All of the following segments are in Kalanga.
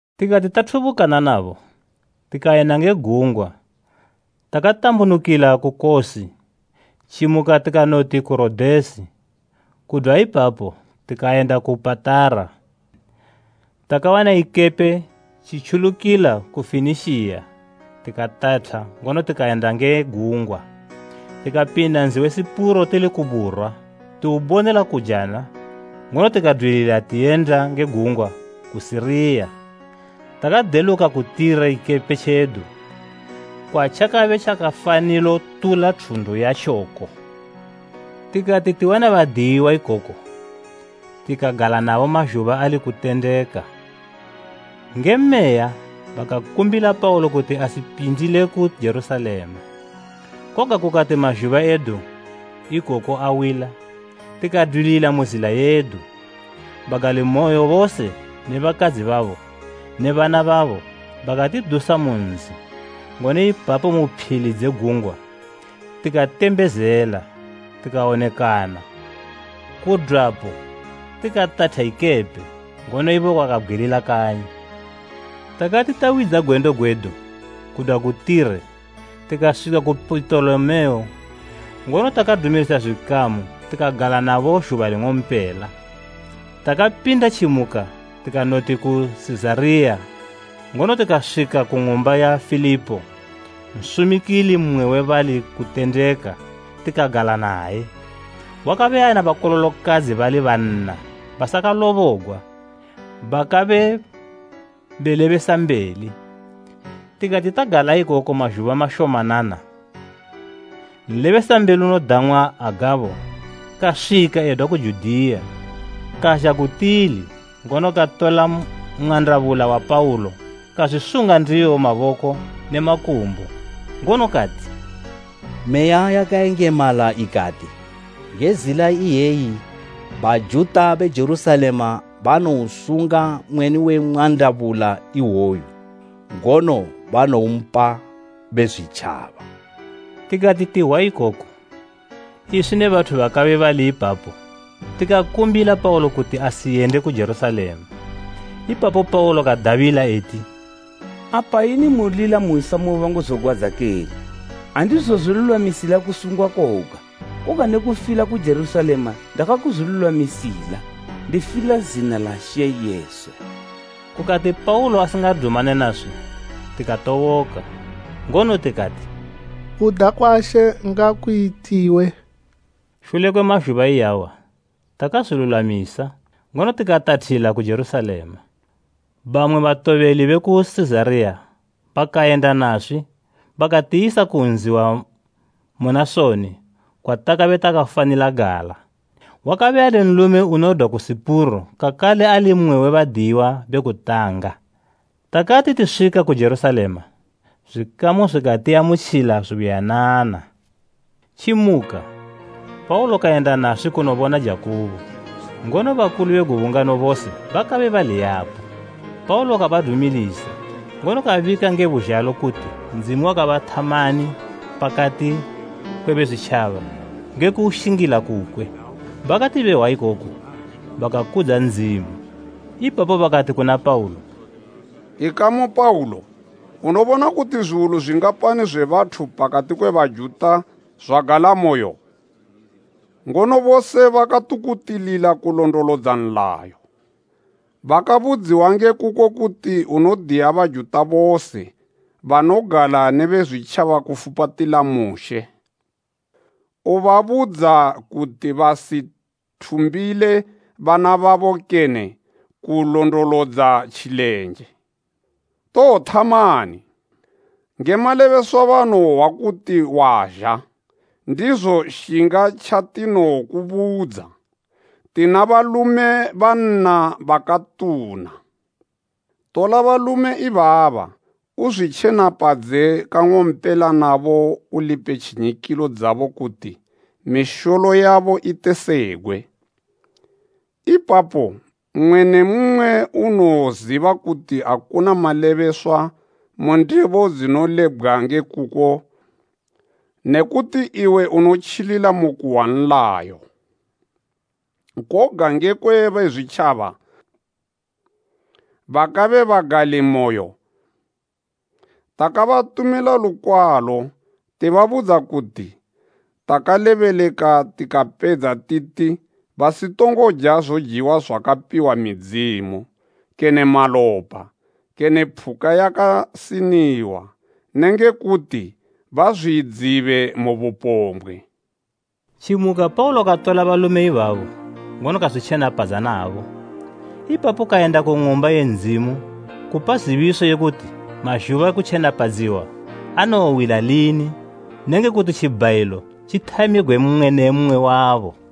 Tikati tathubukana nabo, tikayenda nge gungwa takatambunukila ku Kosi, tjimuka tikanoti ku Rodesi, kudwa ipapo tikayenda ku Patara. Takawana ikepe tjitjulukila ku Fenikiya tikatatha ngono tikayenda nge gungwa. Tikapinda nzi we Sipuro tili ku burwa tiwubonela kujana ngono tikadwilila tiyenda nge gungwa ku Siriya. Takadeluka ku Tire ikepe tjedu kwatjakabe tjakafanilo tula thundu yatjoko. Tikati tiwana badiyiwa ikoko, tikagala nabo mazhuba ali kutendeka. Nge Meya, bakakumbila Paulo kuti asipindile ku Jerusalema. Koga kukati mazhuba edu ikoko awila, tikadwilila mu zila yedu. Bagalimoyo bose ne bakadzi babo ne bana babo bakatidusa mu nzi, ngono ipapo mu phili dze gungwa tikatembezela tikawonekana. Kudwapo tikatatha ikepe, ngono ibo bakabgwilila kanyi. Takati tawidza gwendo gwedu kudwa ku Tire tikaswika ku Pitolemeo ngono takadumilisa zwikamu tikagala nabo zhuba ling'ompela. Takapinda tjimuka tikanoti ku Sizariya ngono tikaswika ku ng'umba ya Filipo nsumikili mmwe we bali kutendeka tikagala naye. Wakabe ana bakololokadzi bali banna basakalobogwa bakabe belebesambeli. Tikati tagala ikoko mazhuba mashomanana, nlebesambeli unodang'wa Agabho kaswika edwa ku Judiya. Kazha ku tili, ngono katola mwandabula wa Paulo kazwisunga ndiwo maboko ne makumbo, ngono kati, “Meya yakayengemala ikati, ‘Nge zila iyeyi Bajuta be Jerusalema banowosunga mweni we mwandabula iwoyu, ngono banowompa Bezwitjaba.’” Tikati tihwa ikoku, iswi ne bathu bakabe bali ipapo tikakumbila Paulo kuti asiyende ku Jerusalema. Ipapo Paulo kadabila eti, “Apa ini mulila muhwisa moyo wangu zogwadza kene? Andizozwilulwamisila kusungwa koga, koga ne kufila ku Jerusalema ndakaguzwilulwamisila ndifila zina la She Jesu.” Kukati Paulo asingadumane naswi tikatoboka ngono tikati, “Kuda kwa She ngakuyitiwe.” Shule kwe mazhuba iyawa takazwilulwamisa, ngono tikatathila ku Jerusalema. Bamwe batobeli be ku Sizariya bakayenda naswi bakatiyisa ku nzi wa Munasoni kwatakabe takafanila gala. Wakabe ali nlume unodwa ku Sipuro kakale ali mmwe we badiyiwa be kutanga. Takati tiswika ku Jerusalema, zwikamu zwikatiamutjila zubuyanana. Tjimuka, Paulo kayenda naswi kunobona Jakubo, ngono bakulu bose bakabe bali yapo. Paulo kabadumilisa, ngono kabika nge buzhalo kuti Ndzimu wakathamani pakati kwe Bezwitjaba nge kuushingila kukwe. Bakati behwa ikoku, bakakudza Ndzimu. Ipapo bakati kuna Paulo, “Ikamu Paulo unobona kuti zwiwulu zwingapani zwe bathu pakati kwe Bajuta zwagalamoyo? Ngono bose bakatukutilila kulondolodza nlayo. Bakabudziwa nge kuko kuti unodiya Bajuta bose banogala ne Bezwitjaba kufupatila Mushe, ubabudza kuti basithumbile bana babo kene kulondolodza tjilenje. Towothamani? Nge malebeswa banowohwa kuti wazha, ndizo shinga tjatinokubudza. Tina balume banna bakatuna. Tola balume ibaba uzwitjenapadze kang'ompela nabo ulipe tjinyikilo dzabo kuti misholo yabo itesegwe. Ipapo mmwe ne mmwe unowoziba kuti akuna malebeswa mu ndebo dzinolebgwa nge kuko ne kuti iwe unotjilila mu kuhwa nlayo. Koga ngekwe Bezwitjaba bakabe bagalimoyo takabatumila lukwalo tibabudza kuti takalebeleka tikapedza titi basitongo ja zojiwa zwakapiwa midzimu kene malopa kene phuka yakasiniwa nenge kuti bazwidzibe mu bupombgwe.” Tjimuka Paulo katola balume ibabo ngono kazwitjenapadza nabo. Ipapo kayenda ku Ng'umba ye Ndzimu kupa zibiso ye kuti mazhuba ekutjenapadziwa anowowila lini nenge kuti tjibhayilo tjithamigwe mmwe ne mmwe wabo.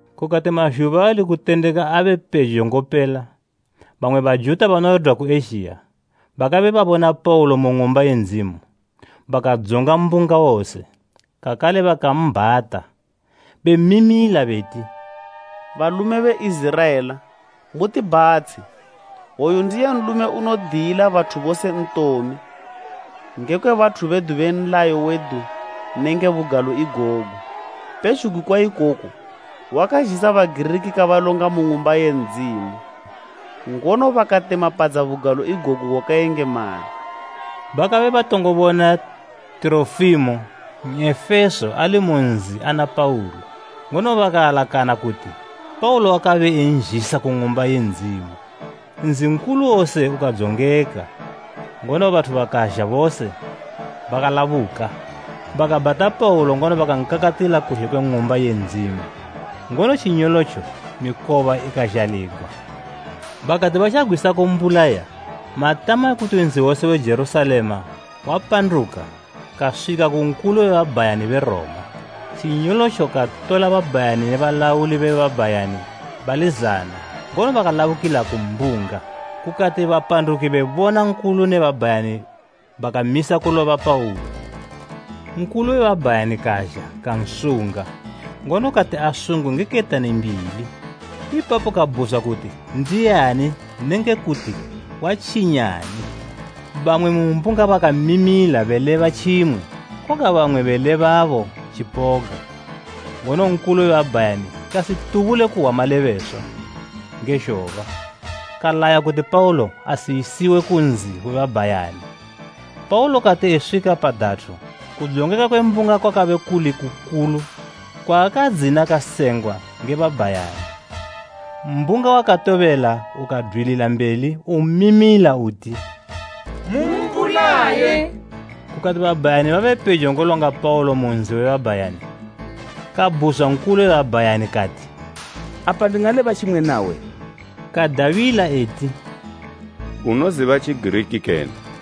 Kukati mazhuba ali kutendeka abe pejo ngopela, bamwe Bajuta banodwa ku Ezhiya bakabe babona Paulo ku Ng'umba ye Ndzimu, bakadzonga mbunga wose, kakale bakambhata bemimila beti, “Balume be Iziraela, mutibhatshe! Oyu ndiye nlume unodiyila bathu bose ntome ngekwe bathu bedu ne nlayo wedu nenge bugalo igogu. Pezhugwi kwa ikoko, wakazhisa Bagiriki kabalonga mu Ng'umba ye Ndzimu, ngono bakatemapadza bugalo igogu gwakayengemala.” Bakabe batongo bona Tirofimo N'efeso ali mu nzi ana Paulo, ngono bakaalakana kuti Paulo wakabe anzhisa ku Ng'umba ye Ndzimu. Nzi nkulu wose ukadzongeka, ngono bathu bakazha bose bakalabuka. Bakabhata Paulo ngono bakankakatila kuzhe kwe Ng'umba ye Ndzimu, ngono tjinyolotjo mikoba ikazhaligwa. Bakati batjagwisa kumbulaya, matama ekuti nzi wose we Jerusalema wapanduka kaswika ku Nkulu we babhayani be Roma. Tjinyolotjo katola babhayani ne balauli be babhayani bali zana ngono bakalabukila ku mbunga. Kukati bapanduki bebona Nkulu ne babhayani bakamisa kuloba Paulo. Nkulu we babhayani kazha kansunga, ngono kati asungwe nge ketani mbili. Ipapo kabhuzwa kuti ndiani nenge kuti watjinyani. Bamwe mu mbunga bakamimila beleba tjimwe, koga bamwe belebabo tjipoga, ngono Nkulu we babhayani kasitubule kuhwa malebeswa nge zhoba, kalaya kuti Paulo ayisiwe ku nzi we babhayani. Paulo kati eswika pa datho kudzongeka kwe mbunga kwakabe kuli kukulu kwaakadzina kasengwa nge babhayani. Mbunga wakatobela ukadwilila mbeli umimila uti, “Mumbulaye!” Kukati babhayani babe pejo ngolonga Paulo mu nzi we babhayani, kabhuzwa Nkulu we babhayani kati, “Apa ndingaleba tjimwe nawe?” Kadabila eti, “Unoziba Tjigiriki kene?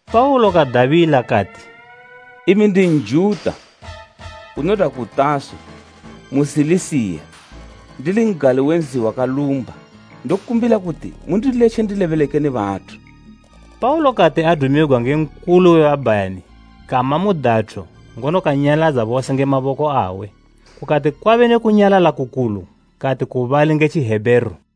Paulo kadabila kati, “Imi ndi Njuta, unodwa ku Taso mu Silisiya, ndili n'gali we nzi wakalumba. Ndokumbila kuti mundiletje ndilebeleke ne bathu.” Paulo kati adumigwa nge Nkulu we babhayani kama mu datho ngono kanyaladza bose nge maboko awe, kukati kwabe ne kunyalala kukulu kati ku bali nge Tjihebheru: